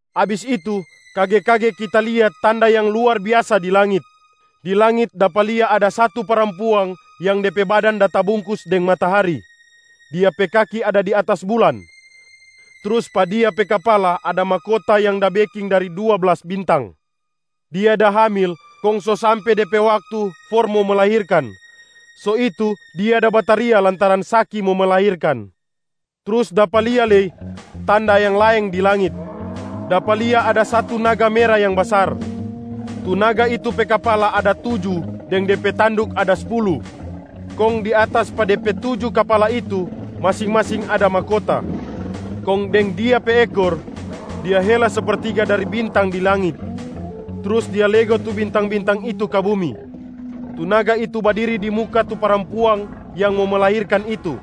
Abis itu, kage-kage kita lia tanda yang luar biasa di langit. Di langit dapa lia ada satu parampuang yang de pe badan da tabungkus deng matahari. Dia pe kaki ada di atas bulan, trus pa dia pe kapala ada mahkota yang da beking dari dua blas bintang. Dia da hamil kong so sampe de pe waktu for mo melahirkan, so itu dia da bataria lantaran saki mo melahirkan. Trus dapa lia lei tanda yang laeng di langit. Dapa lia ada satu naga mera yang basar. Tu naga itu pe kapala ada tuju deng de pe tanduk ada spulu, kong di atas pa de pe tuju kapala itu, masing-masing ada mahkota. Kong deng dia pe ekor, dia hela sepertiga dari bintang di langit, trus dia lego tu bintang-bintang itu ka bumi. Tu naga itu badiri di muka tu parampuang yang mo melahirkan itu,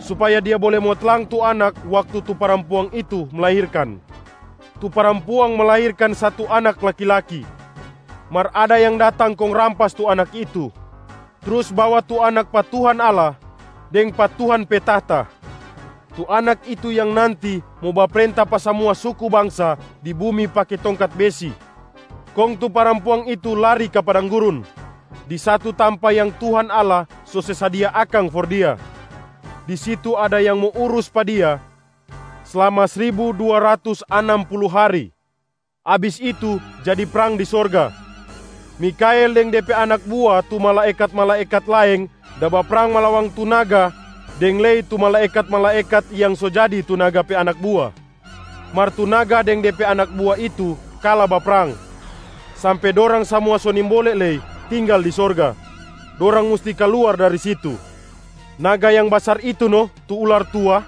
supaya dia bole mo tlang tu Anak waktu tu parampuang itu melahirkan. Tu parampuang melahirkan satu Anak laki-laki. Mar ada yang datang kong rampas tu Anak itu, trus bawa tu Anak pa Tuhan Allah deng pa Tuhan pe tahta. Tu Anak itu yang nanti mo baprenta pa samua suku bangsa di bumi pake tongkat besi. Kong tu parampuang itu lari ka padang gurun, di satu tampa yang Tuhan Allah so se sadia akang for dia. Di situ ada yang mo urus pa dia slama sribu dua ratus anam pulu hari. Abis itu jadi prang di sorga. Mikhael deng de pe anak bua tu malaekat-malaekat laeng da baprang malawang tu naga deng lei tu malaekat-malaekat yang so jadi tu naga pe anak bua. Mar tu naga deng de pe anak bua itu kala baprang, sampe dorang samua so nimbole lei tinggal di sorga, dorang musti kaluar dari situ. Naga yang basar itu no tu ular tua,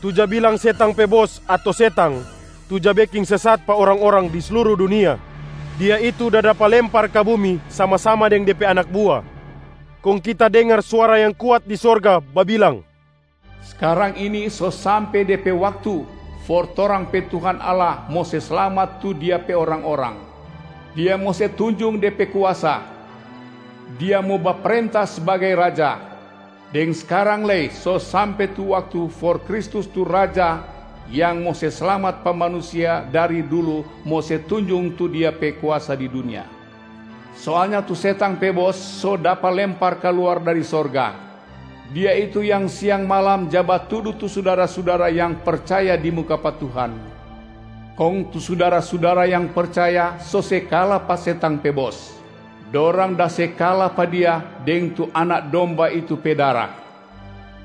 tu ja bilang setang pe bos ato setang tu ja beking sesat pa orang-orang di sluru dunia. Dia itu da dapa lempar ka bumi sama-sama deng de pe anak bua. Kong kita dengar suara yang kuat di sorga babilang, “Skarang ini so sampe de pe waktu for torang pe Tuhan Allah mo se slamat tu Dia pe orang-orang. Dia mo se tunjung De pe kuasa, Dia mo baprenta sbagai Raja. Deng skarang lei so sampe tu waktu for Kristus tu Raja yang mo se slamat pa manusia dari dulu mo se tunjung tu Dia pe kuasa di dunia. Soalnya tu setang pe bos so dapa lempar kaluar dari sorga. Dia itu yang siang malam ja batudu tu sudara-sudara yang percaya di muka pa Tuhan. Kong tu sudara-sudara yang percaya so se kala pa setang pe bos. Dorang da se kala pa dia deng tu Anak Domba itu pe dara,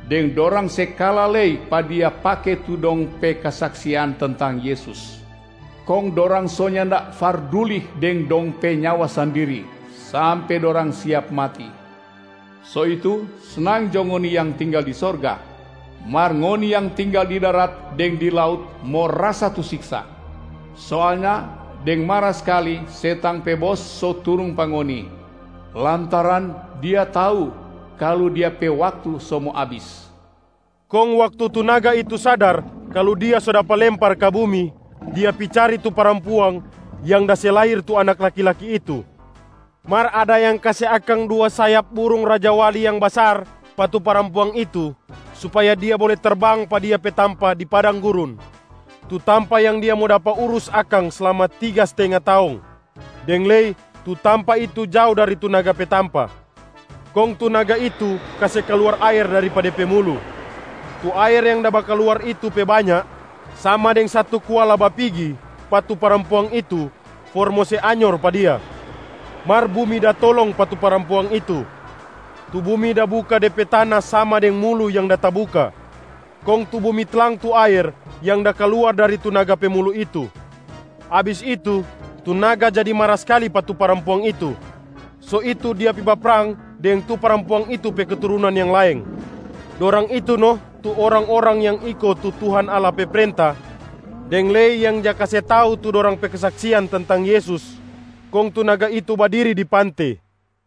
deng dorang se kala lei pa dia pake tu dong pe kesaksian tentang Yesus. Kong dorang so nyanda farduli deng dong pe nyawa sandiri, sampe dorang siap mati. So itu, snang jo ngoni yang tinggal di sorga, mar ngoni yang tinggal di darat deng di laut mo rasa tu siksa. Soalnya deng mara skali setang pe bos so turung pa ngoni, lantaran dia tau kalu dia pe waktu so mo abis.” Kong waktu tu naga itu sadar kalu dia so dapa lempar ka bumi, dia pi cari tu parampuang yang da se lahir tu Anak laki-laki itu. Mar ada yang kase akang dua sayap burung rajawali yang basar pa tu parampuang itu, supaya dia bole terbang pa dia pe tampa di padang gurun, tu tampa yang dia mo dapa urus akang slama tiga stenga taong, deng lei tu tampa itu jao dari tu naga pe tampa. Kong tu naga itu kase kaluar aer dari pa de pe mulu. Tu aer yang da bakaluar itu pe banya sama deng satu kuala bapigi pa tu parampuang itu for mo se anyor pa dia. Mar bumi da tolong pa tu parampuang itu. Tu bumi da buka de pe tana sama deng mulu yang da tabuka, kong tu bumi tlang tu aer yang da kaluar dari tu naga pe mulu itu. Abis itu, tu naga jadi mara skali pa tu parampuang itu. So itu dia pi baprang deng tu parampuang itu pe keturunan yang laeng. Dorang itu no tu orang-orang yang iko tu Tuhan Allah pe prenta deng lei yang ja kase tau tu dorang pe kesaksian tentang Yesus. Kong tu naga itu badiri di pante.